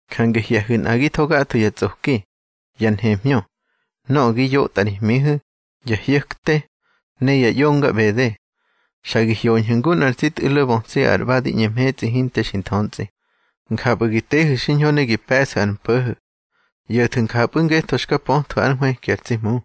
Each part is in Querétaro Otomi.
Jange hye̱hu̱ nꞌagitho gatho ya tsꞌoki, ya nhemhñö, nöꞌö gi yotꞌa ri hmihu̱, ya hyo̱kte, ne ya ꞌyonga ꞌbede. Xa gi hyoñhu̱ ngu nꞌar tsi tꞌu̱lo bötsi ar ꞌba di ꞌñe mhetsꞌi hinte xi nthöntsꞌi. Njapꞌu̱ gi tehu̱ xiñho ne gi pe̱ꞌsu̱ ar mpo̱ho̱. ꞌYo̱thu̱ njapꞌu̱ ngetho xka pöthwu̱ ár nhwëki ar tsi Hmu.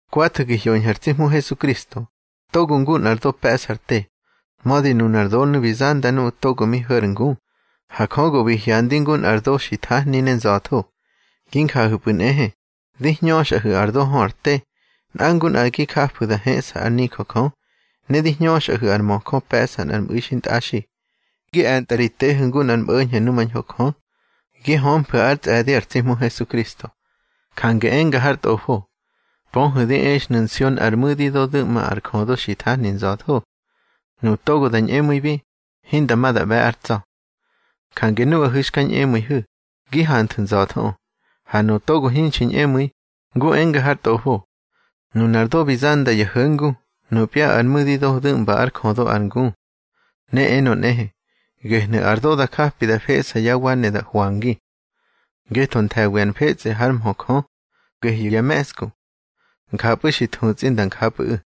Kwathu̱ gi hyoñhu̱ ar tsi Hmu Hesukristo, togo ngu nꞌar do pe̱ꞌsa ar te. Mödi nunar donu̱ bi zanda nuꞌu̱ togo mi ho̱ ar ngu, ha Jö go bi hyandi ngu nꞌar do xi thahni ne nza̱tho. Gi njahu̱pꞌu̱ nꞌehe, di hñöxꞌahu̱ ar do hö ar te, nꞌa ngu nꞌa gi jafu̱ da heꞌsa ár nijö Jö. Ne di hñöxꞌahu̱ ar möjö pe̱ꞌsa nꞌar mꞌu̱i xintꞌaxi, gi e̱ntꞌa ri tehu̱ ngu nꞌar mꞌo̱ñho̱ numañho Jö, gi hömfu̱ ár tsꞌe̱di ar tsi Hmu Hesukristo. Jange enga har Tꞌofo: Pöhu̱ di exnu̱ Nsion ar mu̱dido du̱ꞌma ar jödo xi thahni nza̱tho. Nuꞌu̱ togo da ñꞌemu̱ibi, hinda ma da ꞌbe̱ ár tsa̱. Jange nuꞌahu̱ xka ñꞌemu̱ihu̱, gi hanthu̱ nza̱thoꞌö. Ha nuꞌu̱ togo hinxi ñꞌemu̱i, ngu enga har Tꞌofo: Nunar do bi zanda ya ho̱ngu, nupya ar mu̱dido du̱ꞌmba ár jödo ar ngu. Ne enö nꞌehe: Gehnu̱ ar do da japi da feꞌsa yá wa ne da hwangi. Ngetho nthe̱wi ar mfetsꞌe hár mhö Jö, gehyu̱ ya me̱ꞌsku. Njapꞌu̱ xki thutsꞌi nda njapꞌu̱ꞌu̱.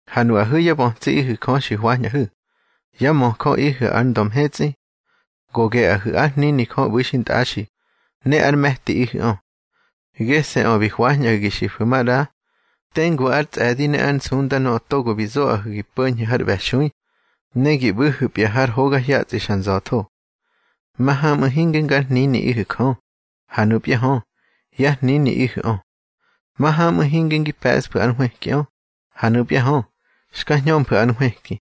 Ha nuꞌahu̱ yá bötsiꞌihu̱ Jö xi hwañꞌahu̱, yá möjöꞌihu̱ ar ndö mhetsꞌi. Go geꞌahu̱ ár hnini Jö ꞌbu̱ xintꞌaxi, ne ár me̱tiꞌihu̱ꞌö. Gese̱ꞌö bi hwañꞌahu̱ gi xifu̱ maꞌra tengu ár tsꞌe̱di ne ár nsunda nöꞌö togo bi zoꞌahu̱ ngi po̱ñhu̱ har ꞌbe̱xui, ne gi ꞌbu̱hu̱pya har hoga hyatsꞌi xa nza̱tho. Mahamꞌu̱ hinge ngar hniniꞌihu̱ Jö, ha nupya hö, yá hniniꞌihu̱ꞌö. Mahamꞌu̱ hinge ngi pe̱ꞌsfu̱ ár nhwëkiꞌö, ha nupya hö, xka hñömfu̱ ár nhwëki.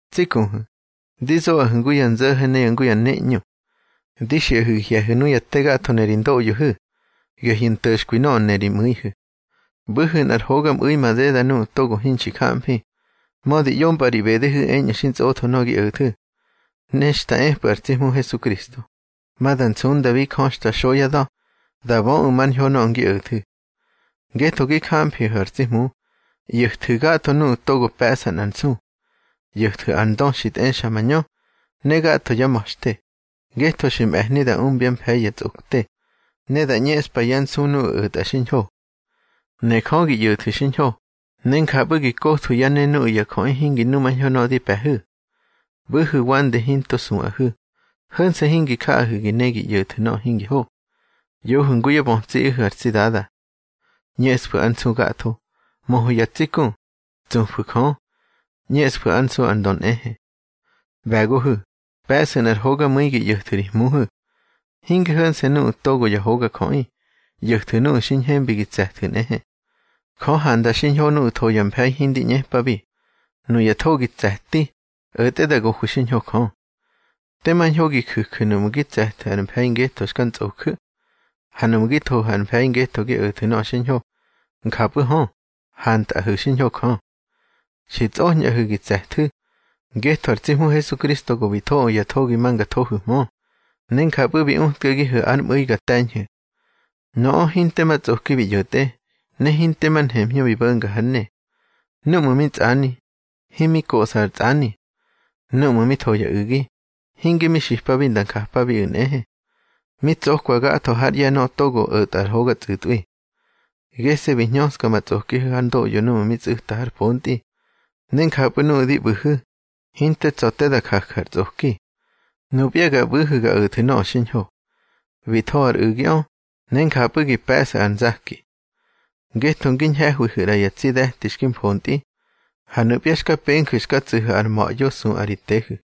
Tsi kuhu̱, di zoꞌahu̱ ngu ya nzo̱ho̱ ne ngu ya neꞌñu. Di xiꞌahu̱ gi hye̱hu̱ nuya te gatho ne ri ndoꞌyohu̱, gehyu̱ nto̱xkwi nöꞌö ne ri mu̱ihu̱. ꞌBu̱hu̱ nꞌar hogamꞌu̱i madeda nuꞌu̱ togo hinxi jamfi, mödi ꞌyompꞌa ri ꞌbedehu̱ eñꞌu̱ xi ntsꞌotho nöꞌö gi o̱thu̱. Ne xta epꞌu̱ ar tsi Hmu Hesukristo, ma da nsundabi Jö xta xo yá da̱, da böꞌu̱ mar ñho nöꞌö ngi o̱thu̱. Ngetho gi jamfihu̱ ar tsi Hmu, ꞌyo̱thu̱ gatho nuꞌu̱ togo pe̱ꞌsa nꞌar nsu. ꞌYo̱thu̱ ar ndö xi tꞌexa mañö, ne gatho yá ma̱xte, ngetho xi mꞌe̱hni da umbya mfe̱i ya tsꞌokte, ne da ꞌñeꞌspa yá nsu nuꞌu̱ o̱tꞌa xiñho. Ne Jö gi ꞌyo̱thu̱ xiñho, ne njapꞌu̱ gi kothwu̱ yá ne nuꞌu̱ ya jöꞌi hingi numañho nöꞌö di pe̱hu̱. ꞌBu̱hu̱ wande hinto suꞌahu̱, ho̱nse̱ hingi jahu̱ gi ne gi ꞌyo̱thu̱ nöꞌö hingi ho. ꞌYohu̱ ngu yá ꞌbe̱goꞌihu̱ ar tsi Dada. ꞌÑeꞌsfu̱ ár nsu gatho. Möhu̱ ya tsi ku. Tsufu̱ Jö. ꞌÑeꞌsfu̱ ár nsu ar ndö nꞌehe. ꞌBe̱gohu̱, pe̱ꞌsu̱ nꞌar hogamu̱i gi ꞌyo̱thu̱ ri hmuhu̱. Hinge ho̱nse̱ nuꞌu̱ togo ya hogajöꞌi, ꞌyo̱thu̱ nuꞌu̱ xi ñhembi gi tse̱thu̱ nꞌehe. Jö handa xiñho nuꞌu̱ tho ya mfe̱i hindi ꞌñepabi, nuya thogi tse̱ti, o̱tꞌe da gohwi xiñho Jö. Tema ñho gi ju̱ju̱ nuꞌmu̱ gi tse̱thu̱ ar mfe̱i ngetho xka ntsꞌoju̱. Ha nuꞌmu̱ gi thohu̱ ar mfe̱i ngetho gi o̱thu̱ nöꞌö xiñho, njapꞌu̱ hö, hantꞌahu̱ xiñho Jö. Xi tsꞌoñꞌahu̱ gi tse̱thu̱; ngetho ar tsi Hmu Hesukristo go bi thoꞌö ya thogi ma nga thohu̱hmö, ne njapꞌu̱ bi utkagihu̱ ár mꞌu̱i ga te̱ñhu̱. Nöꞌö hinte ma tsꞌoki bi ꞌyo̱tꞌe, ne hinte mar nhemhñö bi bo̱nga hár ne. Númꞌu̱ mi tsꞌani, himi koꞌsa ar ntsꞌani. Númꞌu̱ mi tho ya u̱gi, hinge mi xipabi nda njapabipꞌu̱ nꞌehe. Mi tsokwa gatho hár ꞌye̱ nöꞌö togo o̱tꞌa ar hoga tsꞌu̱tꞌwi. Gese̱ bi hñöska ma tsꞌokihu̱ hár ndoꞌyo núꞌmu̱ mi tsꞌu̱ta har pontꞌi, ne njapꞌu̱ nuꞌu̱ di ꞌbu̱hu̱, hinte tsa̱ te da jaju̱ ar tsꞌoki. Nupya ga ꞌbu̱hu̱ ga o̱thu̱ nöꞌö xiñho. Bi tho ar u̱giꞌö, ne njapꞌu̱ gi pe̱ꞌsu̱ ar nzaki. Ngetho ngi ñhe̱hwihu̱ ꞌra ya tsi de̱ti xki mfontꞌi, ha nupya xka penju̱ xka tsu̱hu̱ ar ma̱ꞌyo suꞌa ri tehu̱.